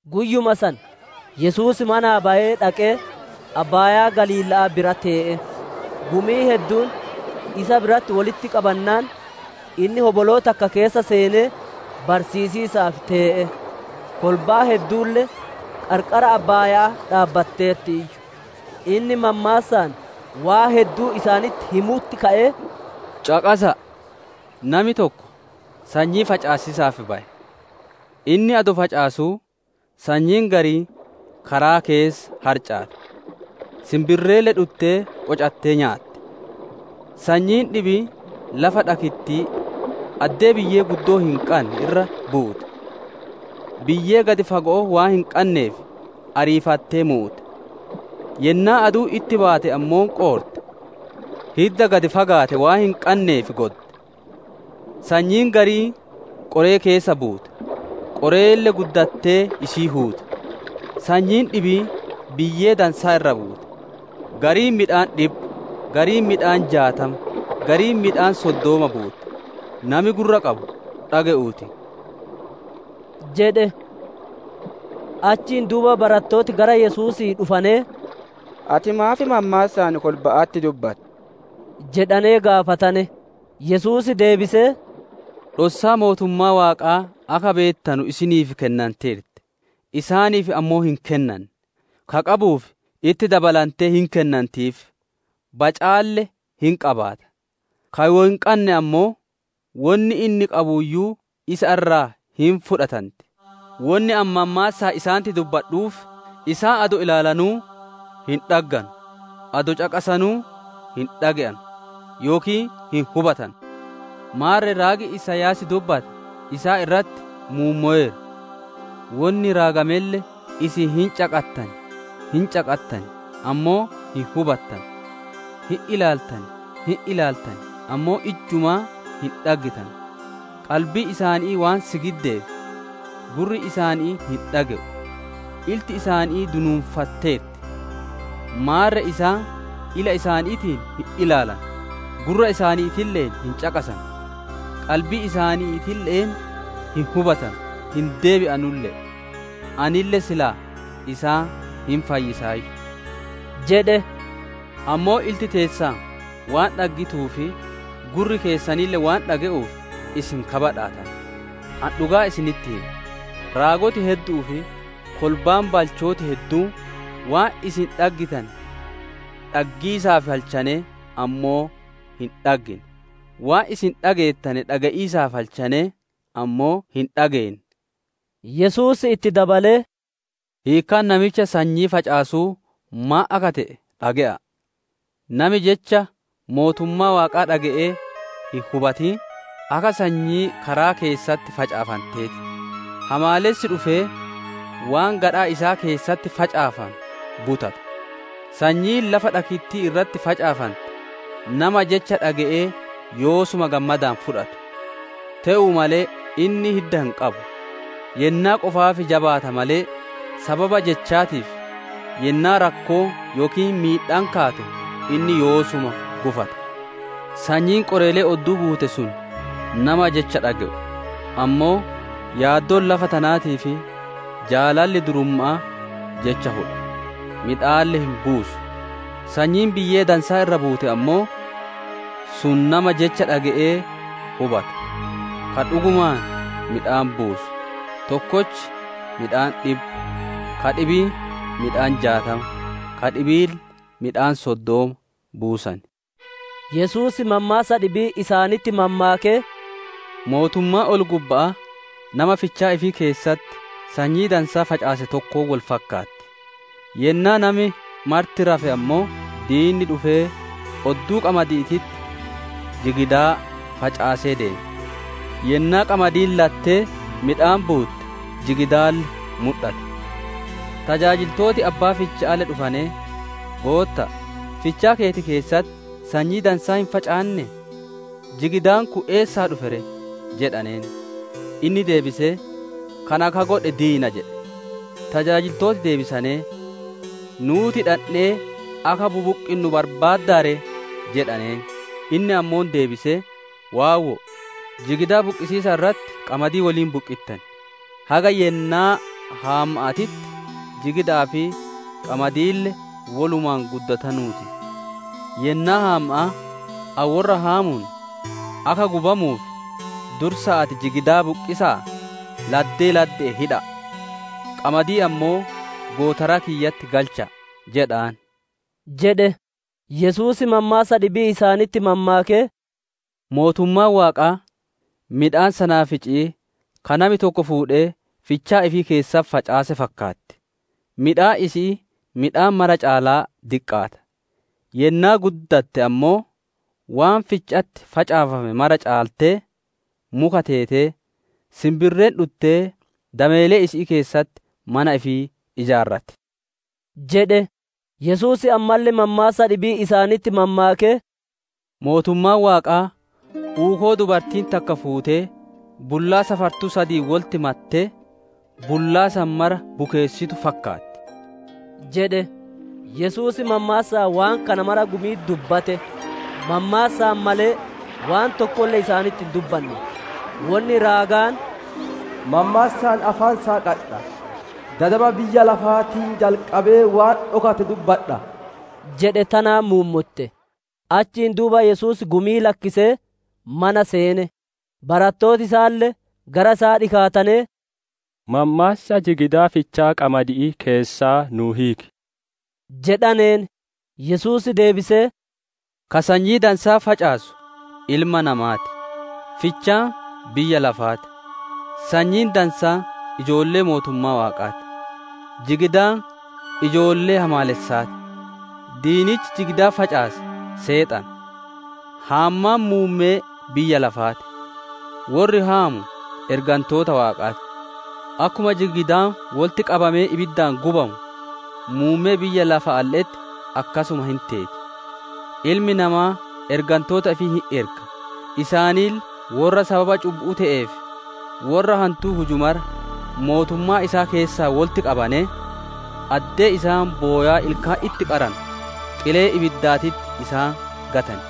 Guyyuma san Yesuus manaa bayee dhaqee abbaayaa Galiila'aa bira tee'e. Gumiin hedduun isa biratti wolitti qabannaan, inni hoboloo takka keessa seenee barsiisiisaaf tee'e; kolbaan hedduulle qarqara abbaaya'aa dhaabbatteertiiyyu. Inni mammaassaan waan hedduu isaanitti himiisaaf ka'ee, «Caqasa'a! Nami tokko sanyii facaasiisaaf baye. Inni adoo facaasuu, sanyiin gariin karaa keessa harcaate, sinbirreelle dhuttee qocattee nyaatte. Sanyiin dhibiin lafa dhakittii, addee biyyee guddoo hin qanne irra buute; biyyee gad fago'oo waan hin qanneef ariifattee muute. Yennaa aduun itti baate ammoo qoorte; hidda gad fagaate waan hin qanneef godde. Sanyiin gariin qoree keessa buute, qoreelle guddattee isii huute. Sanyiin dhibiin biyyee dansaa irra buute, gariin midhaan dhibba, gariin midhaan jaatama, gariin midhaan soddoma buutte. Nami gurra qabu dhage'uu ti!» jedhe. Achiin duuba barattooti gara Yesuusii dhufanee, «Ati maaf mammaassaan kolba'atti dubbatta?» jedhane gaafatane. Yesuus deebisee, «Dhossaa mootummaa Waaqaa akka beettanu isiniif kennanteerti, isaaniif ammoo hin kennanne. Ka qabuuf, itti dabalantee hin kennantiif, bacaalle hin qabaata; ka wo hin qanne ammoo, wonni inni qabuuyyuu isa irraa hin fudhatanti. Wonni ani mammaassaan isaanitti dubbadhuuf, isaan adoo ilaalanuu hin dhagganu, adoo caqasanuu hin dhage'anu, yookiin hin hubatanu. Maarre raagi Isaayaas dubbatte isaan irratti muummoweera; wonni raagamelle, «‹Isin caqasiisa hinuma caqattan, ammoo hin hubattanu, ilaaliisa hinuma ilaaltan, ammoo ijjumaa hin dhaggitanu, qalbiin isaanii waan sigiddeef, gurri isaanii hin dhage'u, ilti isaanii dunuunfatteerti, maarre isaan ila isaaniitiin hin ilaalanu, gurra isaaniille'een hin caqasanu, qalbii isaaniitille'een hin hubatanu, hin deebi'anulle'e, anille silaa isaan hin fayyisaayyu› jedhe. «Ammoo ilti teessan waan dhaggituuf, gurri keessanille waan dhage'uuf isin ka badhaatane. Ani dhugaa isinitti hima, raagoti heddu'uu fi kolbaan balchooti hedduun waan isin dhaggitane dhaggiisaaf halchanee, ammoo hin dhaggine, waan isin dhageettane dhage'iisaaf halchanee, ammoo hin dhageenne» jedheen. Yesuus itti dabalee, «Hiikkaa namicha sanyii facaasuu maan akka te'e dhage'a'a. Nami jecha mootummaa Waaqaa dhage'ee hin hubatin, akka sanyii karaa keessatti facaafantee ti. Hamaalessi dhufee waan gadhaa isaa keessatti facaafame butata. Sanyiin lafa dhakittii irratti facaafante, nama jecha dhage'ee yoosuma gammadaan fudhatu; Te'uu malee inni hidda hin qabu, yennaa qofaaf jabaata malee, sababa jechaatiif yennaa rakkoon yookiin miidhaan kaatu, inni yoosuma gufata. Sanyiin qoreelee odduu buute sun nama jecha dhage'u, ammoo yaaddoon lafa tanaatii fi jaalalli durumma'aa jecha hudha, midhaanille hin buusu. Sanyiin biyyee dansaa irra buute ammoo, sun nama jecha dhage'ee hubatu, ka dhugumaan midhaan buusu, tokkochi midhaan dhibba, ka dhibiin midhaan jaatama, ka dhibiille midhaan soddoma buusan» jedhe. Yesuus mammaassa dhibii isaanitti mammaakee, «Mootummaan ol-gubba'aa nama fichaa ifii keessatti sanyii dansaa facaase tokkoon wol fakkaatti. Yennaa nami marti rafe ammoo, diinni dhufee odduu qamadi'iititti jigidaa facaasee deeme. Yennaa qamadiin lattee midhaan buutte, jigidaalle mudhate. Tajaajiltooti abbaa ficha'aalle dhufanee, ‹Gootta'a, fichaa keeti keessatti sanyii dansaa hin facaannee? Jigidaan kun eessaa dhufe ree?› jedhaneen. Inni deebisee, ‹Kana ka godhe diina› jedhe. Tajaajiltooti deebisanee, ‹Nuuti dhandhee akka bubuqqinnu barbaaddaa ree?› jedhaneen. Inni ammoo deebisee, ‹Waawwo'o; jigidaa buqqisiisa irratti qamadii woliin buqqittan. Haga yennaa haamma'aatitti jigida'aa fi qamadiille wolumaan guddatanuu ti; yennaa haamma'aa, ani worra haamuun, akka gubamuuf dursa'aatii jigidaa buqqisa'aa laddee ladde'een hidha'a, qamadii ammoo gootaraa kiyyatti galcha'a› jedhaan» jedhe. Yesuus mammaassa dhibii isaanitti mammaakee, «Mootummaan Waaqaa midhaan sanaafici'ii ka nami tokko fuudhee fichaa ifii keessatti facaase fakkaatti; midhaan isi'ii midhaan mara caalaa diqqaata, yennaa guddatte ammoo waan ficha'atti facaafame mara caaltee muka teetee, sinbirreen dhuttee dameelee isi'ii keessatti mana ifii ijaarratti» jedhe. Yesuus ammalle mammaassa dhibii isaanitti mammaakee, «Mootummaan Waaqaa uukoo dubartiin takka fuutee bullaa safartuu sadiin wolitti mattee, bullaa san mara bukeessitu fakkaatti» jedhe. Yesuus mammaassaan waan kana mara gumi'itti dubbate; mammaassaan male waan tokkolle isaanitti hin dubbanne. Wonni raagaan, «Mammaassaan afaan saaqadha; dadama biyya lafaatii jalqabee waan dhokate dubbadha» jedhe tanaan muummotte. Achiin duuba Yesuus gumii lakkisee mana seene. Barattooti isaalle gara isaa dhikaatanee, «Mammaassa jigidaa fichaa qamadi'ii keessaa nuu hiiki» jedhaneen. Yesuus deebisee, «Ka sanyii dansaa facaasu Ilma Namaa ti; fichaan biyya lafaa ti; sanyiin dansaan ijoollee mootummaa Waaqaa ti; jigidaan ijoollee hamaalessaa ti; diinichi jigidaa facaase Seexana; haammaan muummee biyya lafaa ti; worri haamu ergantoota Waaqaa ti. Akkuma jigidaan wolitti qabamee ibiddaan gubamu, muummee biyya lafaalle'etti akkasuma hin teeti. Ilmi Namaa ergantoota ifii hin erga; isaanille worra sababa cubbu'uu te'ee fi worra hantuu huju mara mootummaa isaa keessaa wolitti qabanee, addee isaan bowaa ilkaan itti qaranu, qilee ibiddaatitti isaan gatan.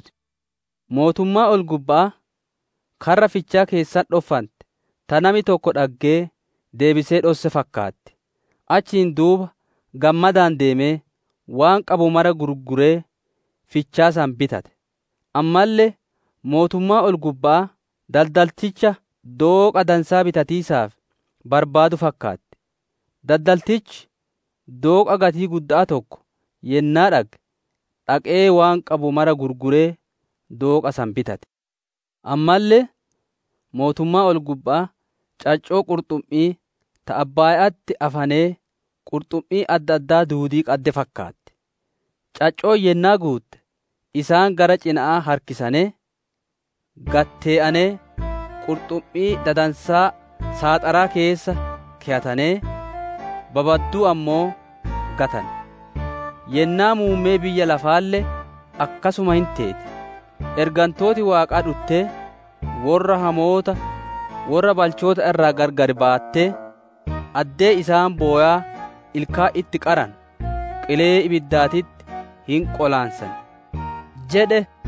Yesuus, «Mootummaan ol-gubba'aa karra fichaa keessatti dhoffante, ta nami tokko dhaggee deebisee dhosse fakkaatti; achiin duuba gammadaan deemee waan qabu mara gurguree fichaa san bitate. «Ammalle, mootummaan ol-gubba'aa daldalticha dooqa dansaa bitatiisaaf barbaadu fakkaatti; daldaltichi dooqa gatii gudda'aa tokko yennaa dhagge, dhaqee waan qabu mara gurguree dooqa san bitate. «Ammalle, mootummaan ol-gubba'aa caccoo qurxummi'ii ta abbaaya'atti afanee qurxummii adda addaa duudii qadde fakkaatti; caccoon yennaa guutte, isaan gara cina'aa harkisanee, gad tee'anee, qurxummii dadansaa saaxaraa keessa keyatanee, babadduu ammoo gatane. Yennaa muummee biyya lafaalle akkasuma hin teeti. Ergantooti Waaqaa dhuttee worra hamoota worra balchoota irraa gargar baattee, addee isaan bowaa ilkaan itti qaranu, qilee ibiddaatitti hin qolaansan» jedhe.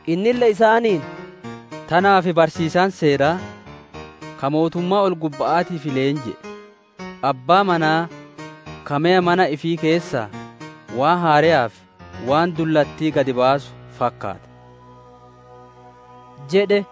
Innille isaaniin, «Tanaaf barsiisaan Seeraa ka mootummaa ol-gubba'aatiif leenji'e, abbaa manaa ka meya mana ifii keessaa waan haareyaa fi waan dullattii gad baasu fakkaata» jedhe.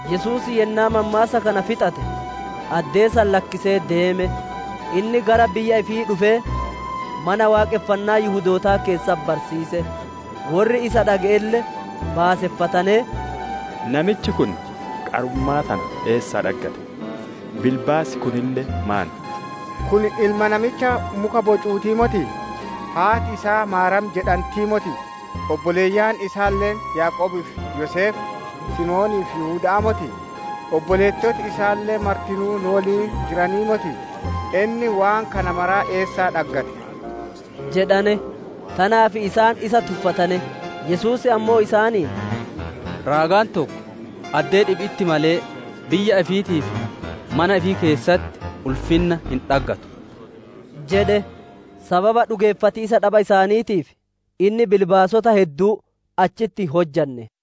Yesuus yennaa mammaassa kana fixate, addee san lakkisee deeme. Inni gara biyya ifii dhufee Mana Waaqonfannaa Yihudootaa keessatti barsiise. Worri isa dhage'elle baaseffatanee, «Namichi kun qarummaa tana eessaa dhaggate, bilbaasi kunille maan?» jedhane. Kun ilma namicha muka bocuutii motii? Haati isaa Maariyaam jedhantii motii? Obboleeyyan isaalle Yaaqoobii fi Yoseef, Simoonii fi Yihuda'aa motii? Obboleettoti isaalle martinuu nu woliin jiranii motii? Inni waan kana mara eessaa dhaggate? Tanaaf isaan isa tuffatane. Yesuus ammoo isaaniin, «Raagaan tokko addee dhibi'itti malee, biyya ifiitii fi mana ifii keessatti ulfinna hin dhaggattu» jedhe. Sababa dhugeeffatiisa dhaba isaaniitiif, inni bilbaasota hedduu achitti hin hunye.